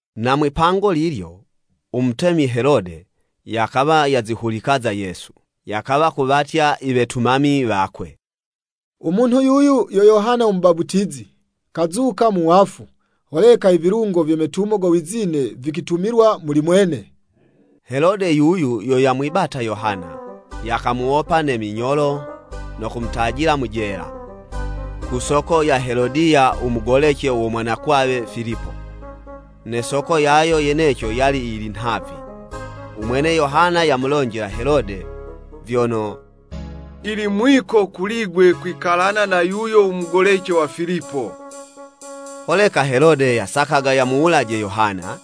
Na mwipango lilyo, u Mutemi Helode, yakawa yazihulika za Yesu. Yakawa kuwatya i wetumami wakwe, “U munhu yuyu, yo Yohana u Mubaputizi, kazuka mu wafu, holeka i vilungo vye metumo go wizine vikwitumilwa muli mwene.” Helode yuyu yo yamwibata Yohana, yakamuwopa ne minyolo no kumutajila mu jela, ku soko ya Helodiya, u mugolece wo mwanakwawe Filipo. Ne soko yayo yeneco yali yili nhavi, u mwene Yohana yamulonjela Helode, vyono, “Yili mwiko kuli'gwe kwikalana na yuyo u mugolece wa Filipo!” Holeka Helode yasakaga yamuwulaje Yohana,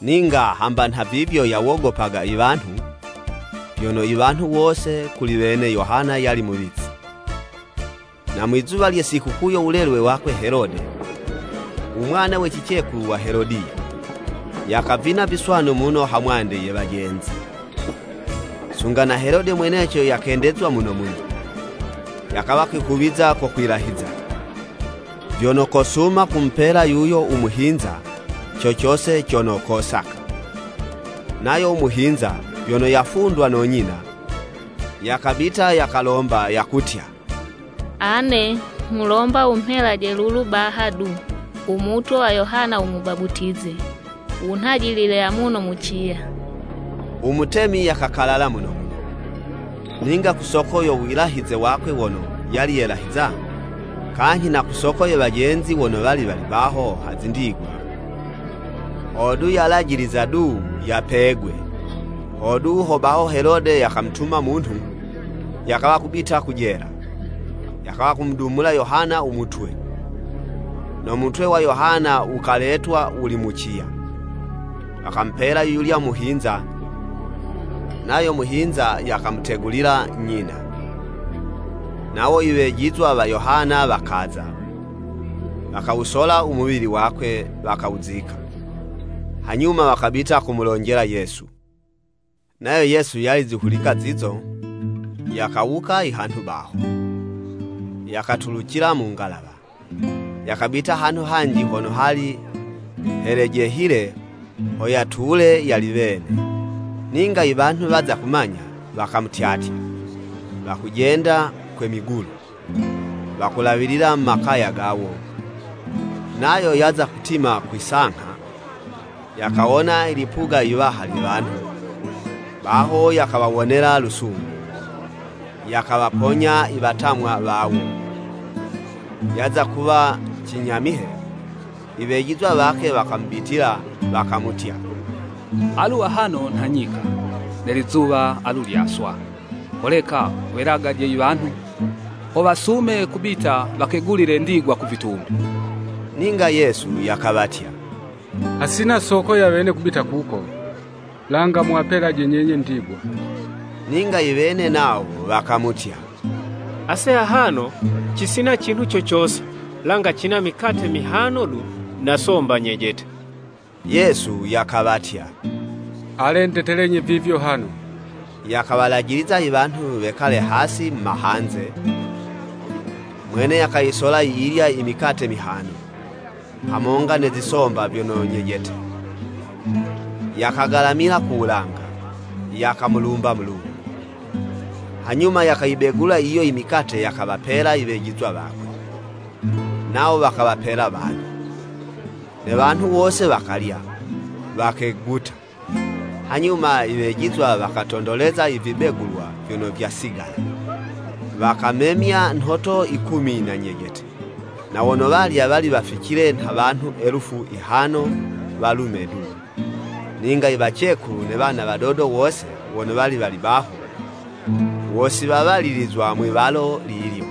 ninga hamba nhavivyo yawogopaga wanhu, vyono i wanhu wose, kuli wene, Yohana yali muwizi. Na mwizuwa lye sikukuu yo wulelwe wakwe Helode, u mwana we cicekulu wa Helodiya, yakavina viswanu muno ha mwande ye wajenzi. Sunga na Helode mweneco yakendezwa muno muno, yakawa kwihuwiza ko kwilahiza, vyono kosuma kumupela yuyo u muhinza, co cose cono kosaka. Nayo u muhinza, vyono yafundwa no nyina, yakabita yakalomba yakutya, “Ane nghulomba wumhelaje lulu baha du, u mutwe wa Yohana u Mubaputizi, wunhajilile amuno mu ciya.” U Mutemi yakakalala muno muno, ninga ku soko yo wilahize wakwe wono yali yelahiza, kanyhi na ku soko ye wajenzi wono wali wali baho ha zindigwa, hodu yalajiliza du yapegwa. Hodu ho baho Helode yakamutuma munhu, yakawa kubita ku jela, yakawa kumudumula Yohana u mutwe. No mutwe wa Yohana wukaletwa wuli mu ciya, wakamupela yuyulya u muhinza, nayo muhinza yakamutegulila nyina. Nawo i wejizwa wa Yohana wakaza, wakawusola u muwili wakwe wakawuzika. Hanyuma wakabita kumulonjela Yesu. Nayo Yesu yali zihulika zizo, yakawuka i hanhu baho, yakatulucila mu ngalawa, yakabita hanhu hanji hono hali helejehile ho yatule yali wene. Ninga i wanhu waza kumanya, wakamutyatya, wakujenda kwe migulu, wakulawilila mu makaya gawo. Nayo yaza kutima kwi'sangha, yakawona i lipuga iwaha lye wanhu, baho yakawawonela lusungu, yakawaponya i watamwa wawo. Yaza kuwa cinyamihe, i wejizwa wakwe wakamubitila, wakamutya, “Alu ahano nha nyika, ne lizuwa alu lyaswa. Holeka wuwelagaje i wanhu, ho wasume kubita wakegulile ndigwa ku vitumbi.” Ninga Yesu yakawatya, “Hasina soko ya wene yo kubitila kuko, langa, muwapelaje nyenye ndigwa.” Ninga i wene nawo wakamutya, “Ase ahano cisina cinhu co cose, langa cina mikate mihano du, na somba nyejete.” Yesu yakawatya, “Ale ndetelenyi vivyo hano.” Yakawalajiliza i wanhu wekale hasi mu mahanze, Mwene yakayisola yiyilya i mikate mihano, hamonga ne zisomba vyono nyejete, yakagalamila ku wulanga, yakamulumba Mulungu. Hanyuma yakayibegula yiyo i mikate yakawapela i wejizwa wakwe, nawo wakawapela wanhu. Ne wanhu wose wakalya, wakeguta. Hanyuma i wejizwa wakatondoleza i vibegulwa vyono vyasigala, wakamemya nhoto yikumi na nyejete. Na wono walya wali waficile nha wanhu elufu yihano walume du, ninga i wacekulu ne wana wadodo wose wono wali wali baho, wo si wawalilizwa mwi'walo lilyo.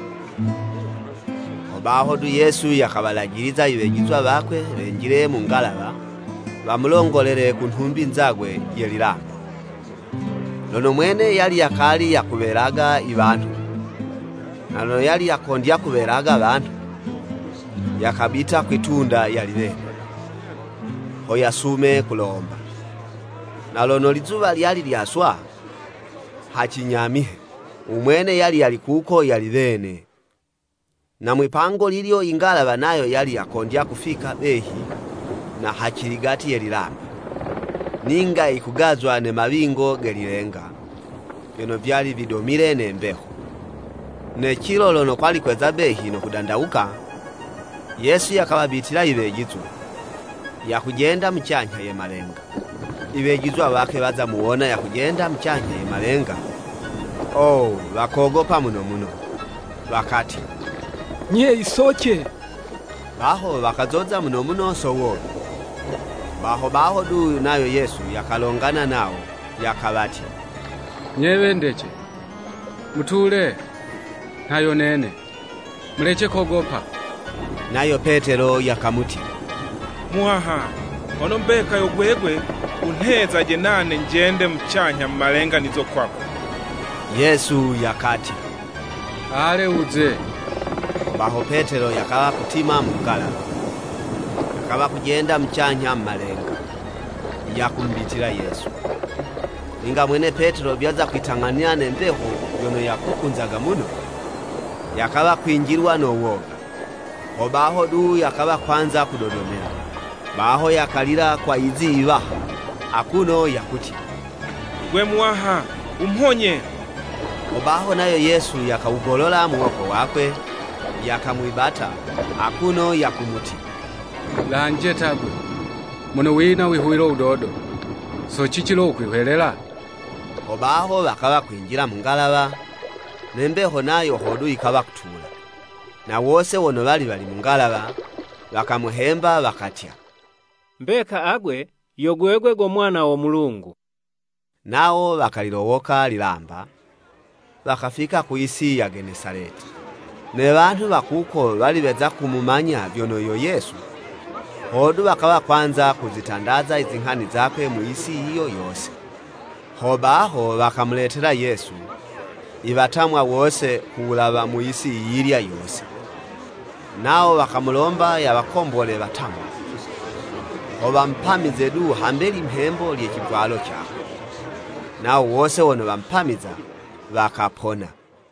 Hobaho du Yesu yakawalajiliza i wejizwa wakwe wenjile mu ngalawa, wamulongolele ku nhumbi nzagwe ye lilamba, lono mwene yali yakali yakuwelaga i wanhu. Na lono yali yakondya kuwelaga wanhu, yakabita kwi'tunda yali wene, ho yasume kulomba. Na lono lizuwa lyali lyaswa, ha cinyamihe, u mwene yali yali kuko yali wene, na mwi'pango lilyo ingalawa nayo yali yakondya kufika behi na ha ciligati ye lilamba, ninga yikugazwa ne mawingo ge lilenga, vyono vyali vidomile ne mbeho. Ne cilo lono kwali kweza behi no kudandawuka, Yesu yakawabitila i wejizwa, yakujenda mucanyha ye malenga, I wejizwa wakwe waza muwona yakujendela mucanyha ye malenga. Oo! Wakogopa muno muno, wakatya, “Nye, Yisoce.” Baho wakazoza muno muno so woga. Baho baho du nayo Yesu yakalongana nawo, yakawatya, “Nye wendece, mutule, nha yo nene. Mulece kogopa!” Nayo Petelo yakamutya, “Muwaha, hono mbeka yo gwegwe, wunhezaje nane, njende mucanyha mu malenga nize kwako.” Yesu yakatya, “Ale, wuze.” Hobaho Petelo yakawa kutima mu ngalawa, yakawa kujenda mucanyha mu malenga, yakumubitila Yesu. Ninga mwene Petelo vyaza kwitang'anila ne mbeho yono yakukunzaga muno, yakawa kwinjilwa no woga, hobaho du yakawa kwanza kudodomela, baho yakalila kwa yizi yiwaha, akuno yakutya, “Gwe Muwaha, wumhonye!” Hobaho nayo Yesu yakawugolola muwoko wakwe, yakamwibata, akuno yakumutya, “Lanje ta 'gwe, mono wina u wihuwilo wudodo! So cici lo wukwihwelela?” Hobaho wakawa kwinjila mu ngalawa, ne mbeho nayo hodu yikawa kutula. Na wose wono wali wali mu ngalawa, wakamuhemba, wakatya, “Mbeka agwe yo gwegwe go Mwana wo Mulungu.” Nawo wakalilowoka lilamba, wakafika ku yisi ya Genesaleti. Ne wanhu wa kuko wali weza kumumanya vyono yo Yesu, hodu wakawa kwanza kuzitandaza i zinghani zakwe mu yisi yiyo yose. Hobaho wakamuletela Yesu, i watamwa wose ku wulawa mu yisi yiyilya yose, nawo wakamulomba yawakombole watamwa, ho wapamize du hambe limhembo lye civwalo cakwe, nawo wose wono wamupamiza, wakapona.